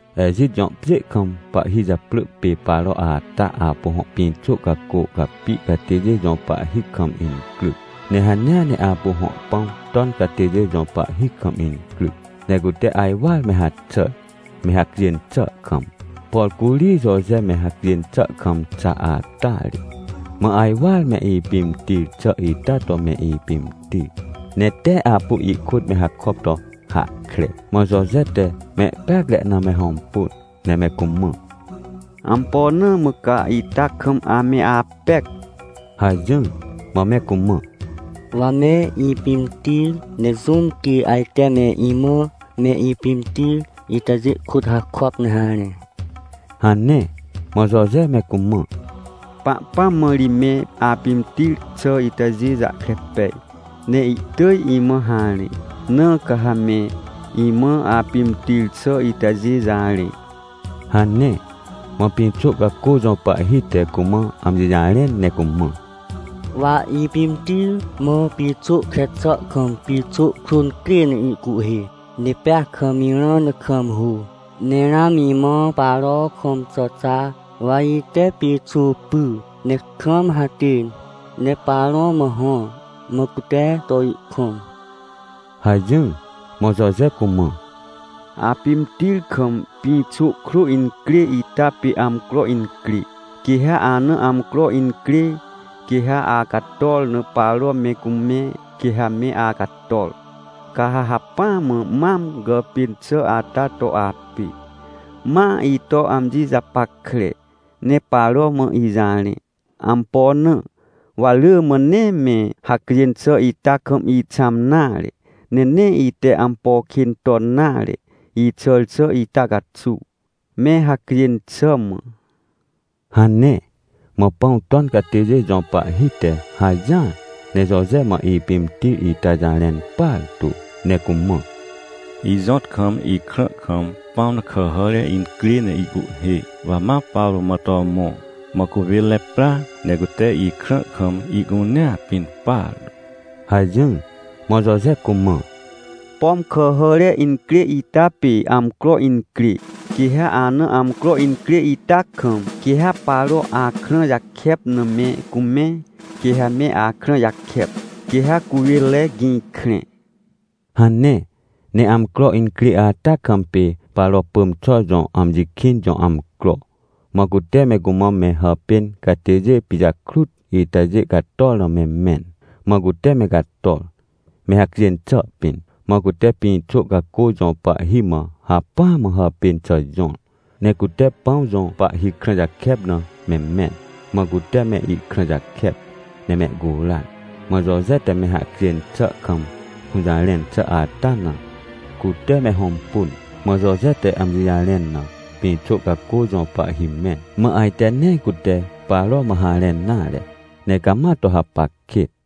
Ejit jõ pjê kam pahhi japrỳ pê Paro ata apu hõ pĩxô cacô capi catêjê jõ pahhi kam incryc, ne hanea ne apu hõ pãw ton catêjê jõ pahhi kam incryc. Ne cute ajwar me haxàr, me hacjên xà kam, por curi Joje me hacjên xà kam xa ata ri. Mã ajwar me ipimtir xà ita to me ipimtir, ne tee apu ihkôt me hakop to hahkre. Mã Joje te mehpeacre na me hõmpun, ne me cumã: — Ampo na mã ca ita kam ame apec? — hajỹr. Mã me cumã: — Wa me ipimtir, ne jũm quê ajte me imã me ipimtir itajê kôt hakop ne harẽ? — hane. Mã Joje me cumã: — Pahpãm mã ri me apimtir xà itajê jahkre pej, ne ihtỳj imã harẽ, na ca ha me imã apimtir xà itajê jarẽ — hane. Mã pĩxô cacô jõ pahhi te cumã amji jarẽn ne cumã: — Wa ipimtir, mã pĩxô kre xà kam pĩxô krô crê ne ihcuhhê. Ne pea kam irã ne kam hô. Ne ramã imã Paro kõm xà xa, wa ite pĩxô pyr, ne kam hatên, ne Paro mã hõr, mã cute to ihkõm — hajỹr. Mã Joje cumã: — Apimtir kam pĩxô krô incrê ita pê amcro incrê. Quê ha ana amcro incrê, quê ha acator na Paro me cumẽ, quê ha me acator. Ca ha hacpỹa mã mam gàpên xà ata to apê. Ma ito amji japackre, ne Paro mã ijarẽ. Ampo na? Wa rỳ mã nee me hacjên xà ita kam ixãm nare. Ne nee ite ampo kên ton nare, ixàr xà ita caxuw, me hacjên xà mã — hane. Mã pãw ton catêjê jõ pahhi te hajỹar, ne Joje mã ipimtir ita jarẽn partu, ne cumã: — Ijõt kam, ikrã kam pãw na kàhàre incrê ne ihcuhhê, wa ma Paro mã to mõ, mã cuwênre pra, ne cute ikrã kam ihcunea pin partu — hajỹr. Mã Joje cumã: — Pom kàhàre incrê ita pê amcro incrê. Quê ha ana amcro incrê ita kam, quê ha Paro akrã jakep na me cumẽ, quê ha me akrã jakep, quê ha cuwênre gĩ krẽ — hane. Ne amcro incrê ata kam pê Paro pỳm xà jõ amji kĩn jõ amcro. Mã cute me cumã me hàpên catêjê pijakrut itajê cator na me mẽn, mã cute me cator, me hacjên xà pĩn. Mã cute pĩxô cacô jõ pahhi mã hacpỹa mã hàpên xà jõr, ne cute pãw jõ pahhi krã jakep na me mẽn, mã cute me ihkrã jakep ne mehcuran. Mã Joje te me hacjên xà kam hũjarẽn xà ata na, cute me hõmpun. Mã Joje te amji jarẽn na, pĩxô cacô jõ pahhi mẽn, mã ajte nee cute Paro mã harẽn nare, ne cama to hapac kêt.